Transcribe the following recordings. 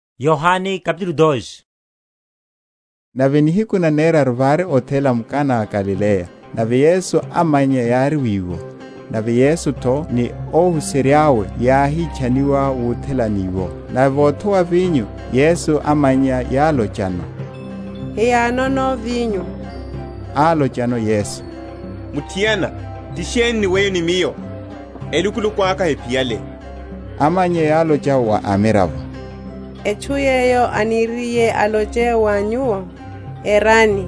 Otatushiwa wa mahi okhala vinyo. Nave nihiku naneraru vári othela m’Kana a m’Galileya; nave Yesu amannya yári wiwo. Nave Yesu’tho ni óhuserya’we yáhitchaniwa wuthelani iwo. Nave vothowa vinyo, Yesu amannya yálochano, Hiyanono vinyo. Álochano Yesu, Muthiana, ti sheni ni weyo ni Miyo? elukuluku aka hephiyale. Amannya yálocha wa amiravo, Etchu yeyo aniriye aloche wa nyuwo, erani.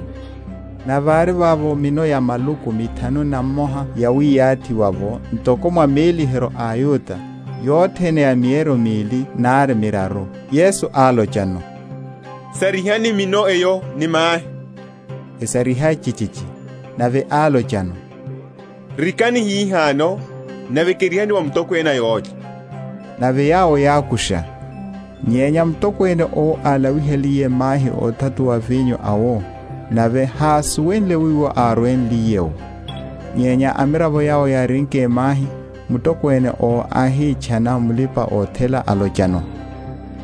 Nave vári vavo mino ya maluku mithanu na mmoha yawiyathiwa’wo ntoko mwa méliheryo a aYuda, yothene ya mieryo mili nari miraru. Yesu álochano, Sarihani mino eyo ni mahi. Esariha chichichi. Nave álochano, Rikani hihano, nave kerihani wa mutokwene a yólya. Nave yawo yákusha. Nyenya mutokwene owo álawihaliye mahi óthatuwa vinyo awo, nave hásuwenle wiwo árwenliye’wo (nyenya amiravo yawo yárinke mahi), mutokwene owo áhitchana mulipa‐othela, alochano,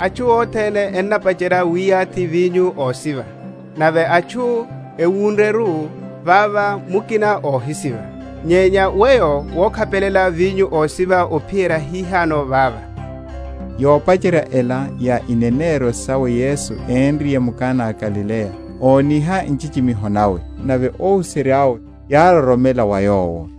Atchu othene ennapacherya wiyathi vinyo ósiva; nave atchu ewun?-?ryeru, vavo mukina óhisiva; nyenya weyo wokhapelela vinyo ósiva ophiyerya hihano vava. Yopacherya ela ya ineneryo sawe Yesu énriye m’Kana a m’Galileya óniha nchichimiho nawe; nave óhuserya’we yároromela mwa Yowo.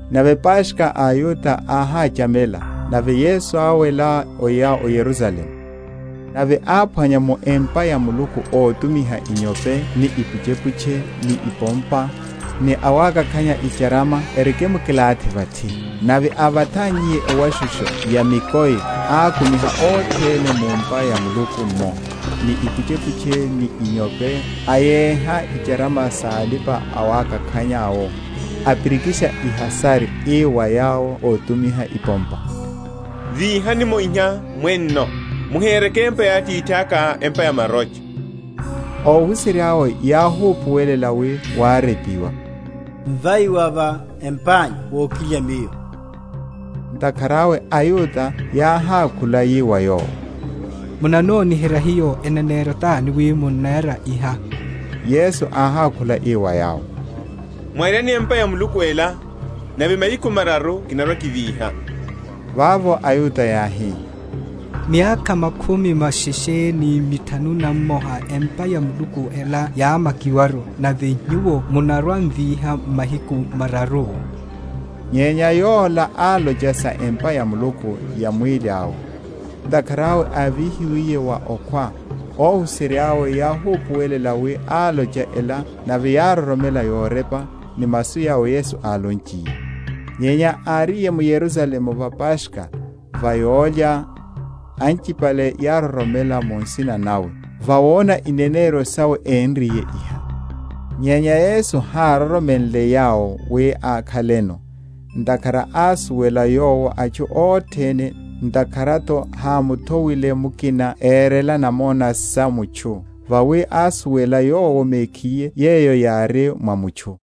Nave Paskha a aYuda áhachamela, nave Yesu áwela, oya o Yerusalemu. Nave áphwanya mu empa ya Muluku ótumiha inyope ni ipuchepuche ni ipompa, ni awakakhanya icharama erikimkilathi vathi. Nave ávathannyiye ewashushu ya mikoi, ákumiha othene mu’mpa ya Muluku’mmo, ni ipuchepuche ni inyope; ayéha icharama sa alipa‐awakakhanya’wo, apirikisha ihasari; ii wa yawo ótumiha ipompa, Víhani’mo iha mwenno; muhereke empa ya Atithaka empa ya marocha. Óhuserya’we yáhupuwela wi wárepiwa, Mvai wa va empa’nyu wokilya miyo. Ntakhara awe aYuda yáhákhula yi wa Yowo, Munanoniherya hiyo eneneryo tani, wi munnera iha? Yesu áhákhula ii wa yawo, Mwaryani empa ya Muluku ela, nave mahiku mararu kinarwa‐kivíha. Vavo aYuda yáhi, Miyakha makhumi masheshe ni mithanu na mmoha empa ya Muluku ela yámmakiwaru, nave Nyuwo munarwa‐mvíha m’mahiku mararu? Nyenya yola álocha sa empa ya Muluku ya mwíli awe. Ntakhara awe ávíhiwiye wa okhwa, óhuserya’we yáhupuwela wi álocha ela; nave yároromela yorepa, ni masu yawo Yesu álonchiye. Nyenya áriye m’Yerusalemu va Paskha, va yólya, anchipale yároromela mu nsina nawe, vawona ineneryo sawe énriye iha. Nyenya Yesu hároromenle yawo wi akhaleno, ntakhara ásuwela Yowo atchu othene, ntakhara’tho hámuthowile mukina erele namona sa mutchu; vawi ásuwela Yowo mekhiye yeyo yári mwa mutchu.